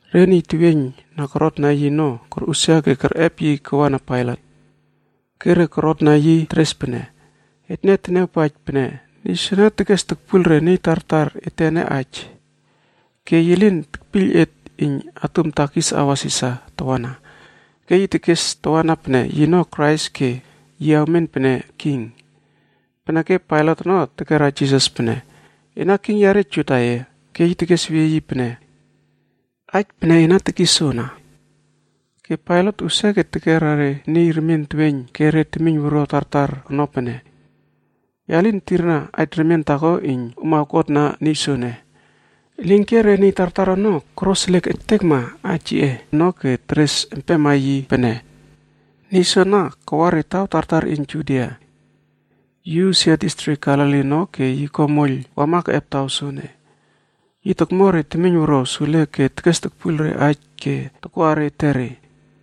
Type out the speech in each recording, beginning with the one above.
Re niy teweiyn na korotna yi ono korꞌusia ke kerꞌep yi kawana Pailata. Ke re korotna yi teres pene, “Etne teniawpaij pene niy soene tekes tokpuiyl re niy tartar ete ene aij. Ke yi lin tekpiyl et iyn atum takis awa Sisarb tawana. Ke yi tekes tawana pene yino Krais ke yi awmen pene king.” Peneke Pailat ono tekera Jisas pene, “Ena king yare Juda ye?” Ke yi tekesweyie yi pene, “Aij pene ena tekis soana.” Ke Pailat usia ke kestekna re niy remien teweiyn ke re temiyn wuruaw tartar ono pene, “Yane lin tirna aij remien taako iyn om awkotna niy soene.” Elinke re niy tartar ono koroseliek ektekma aij yiꞌe ono ke teres empema yi pene, “Niy soana kawa re taw tartar iyn Judia. Yi usia distrik Galili ono ke ko moiyl wama keꞌep taw soene. Yi tokmo re temiyn wuruaw sule ke tekestokpuiyl re aij ke tokoꞌa re etere.”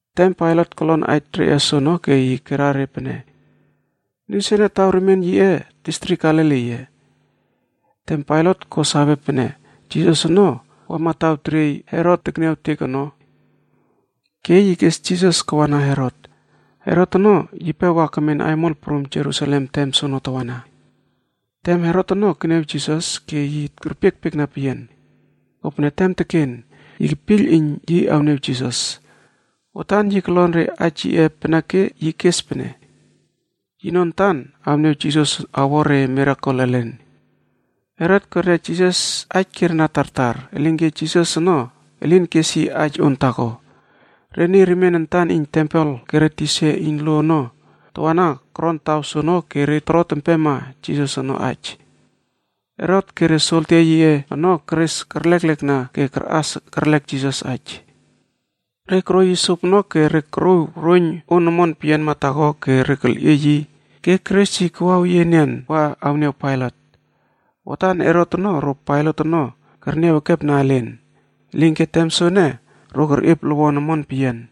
Tem Pailat kolon aij reꞌe soono ke yi kera re pene, “Niy soene taw remien yiꞌe distrik Galili ye?” Tem Pailat ko sawe pene Jisas ono wama taw teriey Herot tekniawtek ono, ke yi kes Jisas kawana Herot. Herot ono yipe wa kemen aimol prum Jerusalem tem soene tawana. Tem Herot ono keniaw Jisas ke yi kerpiekpiekna peyian, kopene tem teken yi kepiyl iyn yi awniaw Jisas. Watan yi kolon re aij yiꞌe peneke yi kes pene, yino antan awniaw Jisas awo re mirakel elen. Herot kerna Jisas aij kierna tartar, elinke Jisas ono elin kes yi aij on taako. Re niy remien antan iyn tempel ke re tisa iyn lo ono tawana koron taw soono ke re torot empema Jisas ono aij. Herot ke re soldia yiꞌe ono keres kerleklekna ke karꞌas kerlek Jisas aij. Re koro yi sopono ke re korouw roiyn on omon peyianma taako ke re kelꞌiey yi ke keres yi kawaweyie enian wa awniaw Pailat. Watan Herot ono ro Pailat ono kerniaw ekepna elen, elinke tem soene, ro kerꞌiep lowon omon peyian.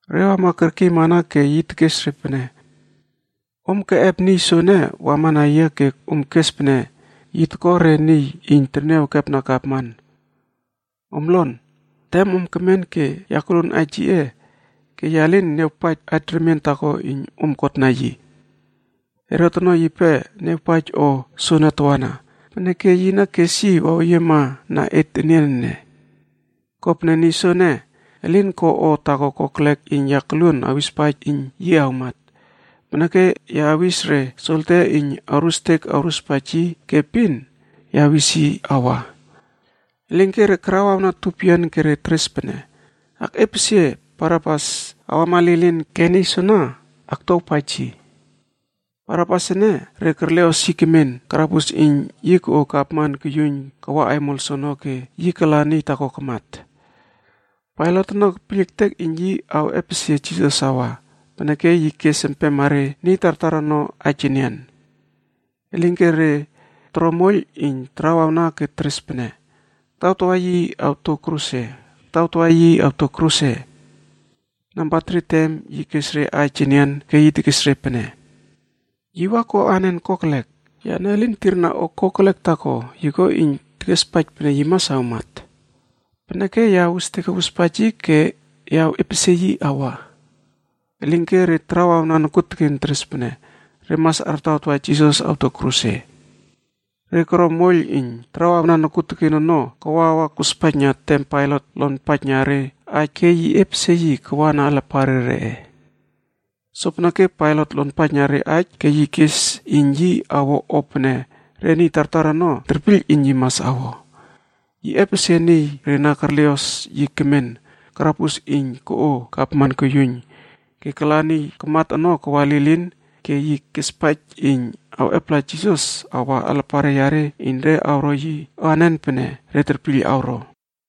Re wama kerkiymana ke yi tekes re pene, “Om keꞌep niy soene wamana yia ke om kes pene yi toko re niy iyn terniaw ekepna gavman. Om lon! Tem om kemen ke ya koluon aij yiꞌe ke ya lin niawpaij aij remien taako iyn om kotna yi. Herot ono yipe niawpaij o soene tawana, peneke yi na kes yi waweyiemana et enian ene. Kopene niy soene, elin ko o taako kokelek iyn ya koluon awispaij iyn yi awmat. Peneke ya awis re soldia iyn awrustek awruspaij yi ke epin ya awis yi awa.”c Elinke, re karawawna utup peyian ke teres pene, “Akꞌiepesie Barabas awama lilin ke niy soana, aktuawpaij yi!” (Barabas ene re kerleꞌos yi kemen karabus iyn yi koꞌo gavman koyuiyn kawa aimol soono ke yi kala niy taako kamat.) Pailat ono kepiyl ektek iyn yi awꞌepesie Jisas awa, peneke yi kes empema re niy tartar ono aij enian. Elinke re toro moiyl iyn tarawawna ke teres pene, “Aktuawtawa yi awto kruse! Aktuawtawa yi awto kruse!” Namba tri tem yi kes re aij enian ke yi tekes re pene, “Yi wa ko o anen kokelek? Yane lin tirna o kokelek taako yi ko iyn tekespaij pene yi mas awmat. Peneke ya awustek awuspaij yi ke ya awꞌiepesie yi awa.” Elinke re tarawawna nokuoteken teres pene, re mas artawtawa Jisas awto kruse. Re koro moiyl iyn tarawawna nokuoteken ono kawa wa kospaijna tem Pailat lonpaijna re aij ke epesie yi kawana alapare reꞌe. Sopeneke Pailat lonpaijna re aij ke kes iyn yi awo o pene, re niy tartar ono terpiyl iyn yi mas awo. Yi epesie niy re na kerleꞌos yi kemen karabus iyn koꞌo gavman koyuiyn ke kala niy kamat ono kawa lilin. Ke yi kespaij iyn awꞌepala Jisas awa alapare yare iyn re awro yi anen pene re terpiyl awro.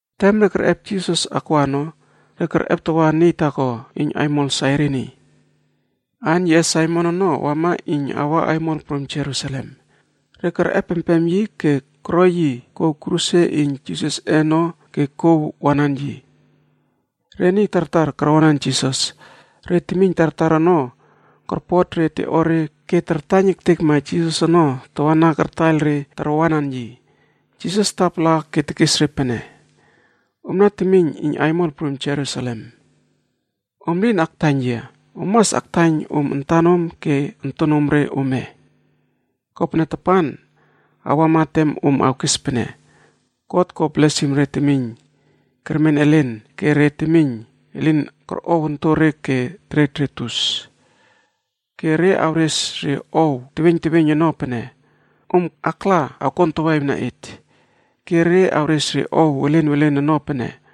Tem re kerꞌep Jisas akwa ono, re kerꞌeptawa niy taako iyn aimol Sairini, aan yiꞌe Saimon ono wama iyn awa aimol prum Jerusalem. Re kerꞌepempem yi ke koro yi kouw kruse iyn Jisasꞌe ono ke kouw wanan yi. Re niy tartar karwanan Jisas. Re temiyn tartar ono korpot re teꞌore ke tartaiyn ektekma Jisas ono tawana kartaiyl re tarwanan yi. Jisas tapala ke tekes re pene, “Omna temiyn iyn aimol prum Jerusalem, om lin aktaiyn yia, om mas aktaiyn om antanom ke ontonomre ome. Kopene tapan awama tem om awkes pene, ‘God ko blesim re temiyn kermen elen ke re temiyn elin korꞌow ontore ke terej re tus.’ Ke re awres re ow teweiyn teweiyn ono pene, Om akla awkontawaꞌiwna et, ke re awres re ow welen welen ono pene,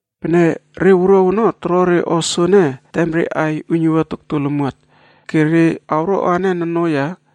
Pene re wuruaw ono toro re o soene tem re aiy uiynuwua tokto lomuat. Ke re awro anen ono ya?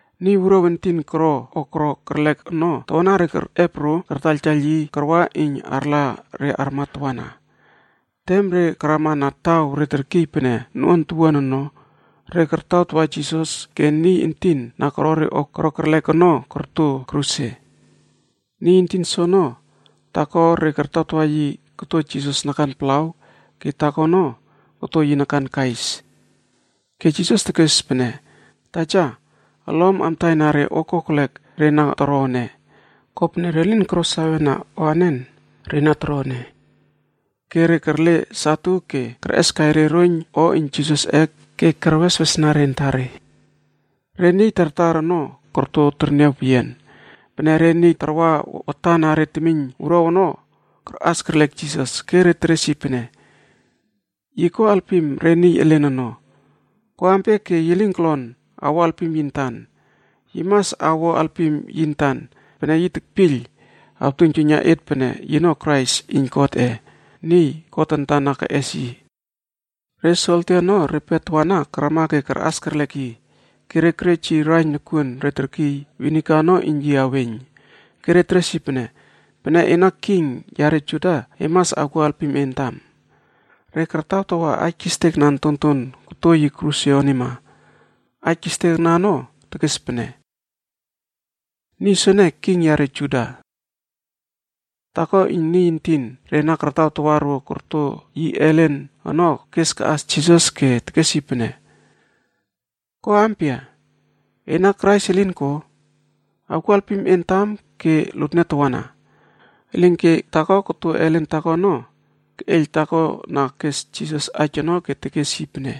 Niy wuruaw entin koro o koro kerlek ono tawana re kerꞌep ro kartaiyltaiyl yi karwa iyn arla re armat tawana. Tem re karama na taw re terkiy pene Noꞌuan Towuan ono, re kartawtawa Jisas ke niy entin na koro re o koro kerlek ono korto kruse. Niy entin soono, taako re kartawtawa yi koto Jisas nakan palaw ke taako ono koto yi nakan kais. Ke Jisas tekes pene, “Taja, olom amtaina re o kokelek re na toro ene. Kopene re lin koro sawe na o anen re na toro ene.” Ke re kerle satu ke kerꞌeskai re roiyn o iyn Jisasꞌe ke kerwesna re antare. Re niy tartar ono korto terniaw peyian, pene re niy tarwa watan na re temiyn wuruaw ono karꞌas kerlek Jisas. Ke re teres yi pene, “Yi ko alpim re niy elen ono, ko ampia ke yi lin kolon awo alpim yi antan. Yi mas awo alpim yi antan, pene yi tekpiyl awtuiynjuiyna et pene yino Krais iyn Godꞌe, niy God antan na keꞌes yi.” Re soldia ono repe tawana karama ke re karꞌas kerlek yi, ke kerej yi raiyn nokuon re terkiy viniga ono iyn yi aweiyn. Ke re teres yi pene, “Pene ena king yare Juda, e mas awkuo alpim e antam.” Re kartawtawa aij kistekna ontonton koto yi kruse onima. Aij kistekna ono tekes pene: NIY SOENE KING YARE JUDA. Taako iyn niy entin re na kartawtawa ro korto yi ellen ono kaꞌas Jisas ke tekes yi pene, “Ko ampia, ena Krais elin ko? Ko ampia ke e lin koluon awkuo alpim e antam ke awkuo alpim lotne tawana!” Elinke taako koto ellen taako ono, keꞌeiyl taako na kes Jisas aij ono ke tekes yi pene,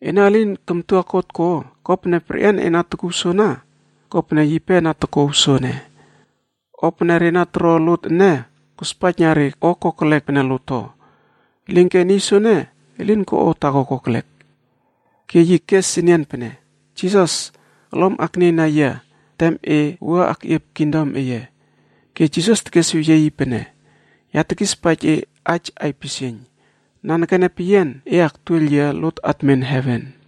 “Ena lin tamtua God ko? Kopene perꞌian e na tokuw soana, ko pene yipe na tokouw soene. O pene re na toro lot ene, kospaijna re o kokelek pene lot to. Elinke niy soene elin ko o taako kokelek.” Ke yi tekes enian pene, “Jisas, olom aknieyna yia tem e wua akꞌiep kingdom eye.” Ke Jisas tekesweyie yi pene, “Ya tekispaij e aij aipisieiyn, nanekene peyian e aktuoiyl yia lot atmen heven.”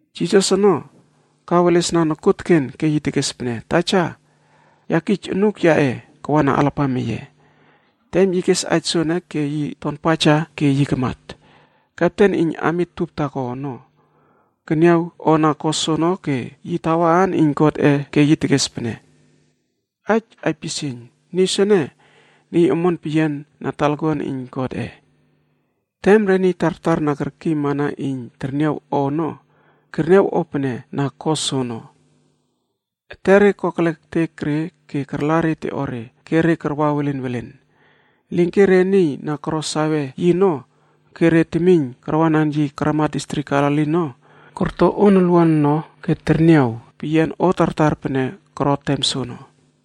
Jisas ono kawelesna nokuoteken ke tekes pene, “Taja! Ya kij anuk yaꞌe kawa na alapam eye.f Tem yi kes aij soene ke yi tonpaija ke yi kamat. Kepten iyn ami tup taako ono keniaw o na ko soono ke yi tawa aan iyn Godꞌe ke yi tekes pene, “Aij aipisieiyn, niy soene niy omon peyian na talakuan iyn Godꞌe.” Tem re niy tartar na kerkiymana iyn terniaw o ono, kerniaw o pene na ko soono, etere kokelek ektek re ke karla re teꞌoreg ke re karwa welen welen. Elinke re niy na koro sawe yi ono ke re temiyn karwanan yi karama distrik Galili ono korto on olwuan ono ke terniaw peyian o tartar pene koro tem soono.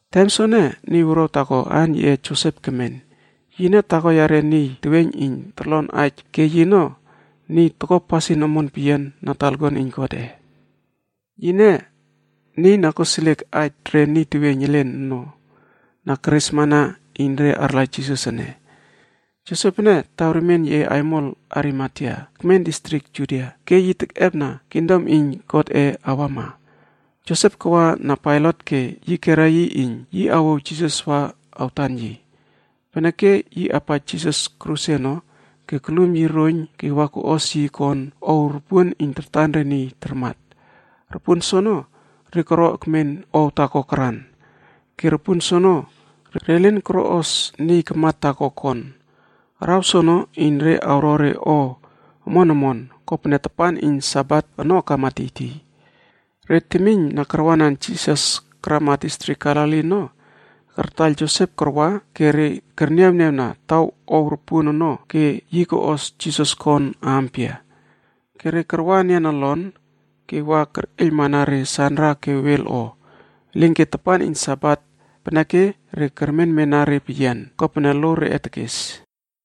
Tem soene niy wuruaw taako aan yiꞌe Josep kemen. Yine taako yare niy teweiyn iyn torlon aij ke yino niy toko pasin omon peyian na talakuan iyn Godꞌe. Yine niy na koseliek aij re niy teweiyn elen ono na keresmana iyn re arla Jisas ene. Josep ene taw remien yiꞌe aimol Arimatea, ekmen distrik Judia. Ke yi tekꞌepna kingdom iyn Godꞌe awama. Josep kawa na Pailat ke yi kera iyn yi awouw Jisas wa awtan yi. Peneke yi apaij Jisas kruse ono ke kolum yi roiyn ke wa koꞌos yi kon ow ropuon iyn tartan re niy tarmat. Ropuon soono, re koro ekmen ow taako karan. Ke ropuon soono, re lin koroꞌos niy kamat taako kon. Araw soono iyn re awro re o omon omon, kopene tapan iyn Sabat ono akama tiytiy. Re temiyn na karwanan Jisas karama distrik Galili ono kartaiyl Josep karwa ke re karniawniawna taw ow ropuon ono ke yi koꞌos Jisas kon ampia. Ke re karwa enian olon ke wa kerꞌeiylmana re sanra ke wel o. Elinke tapan iyn Sabat, peneke re kermenmena re peyian. Kopene lo reꞌe tekes.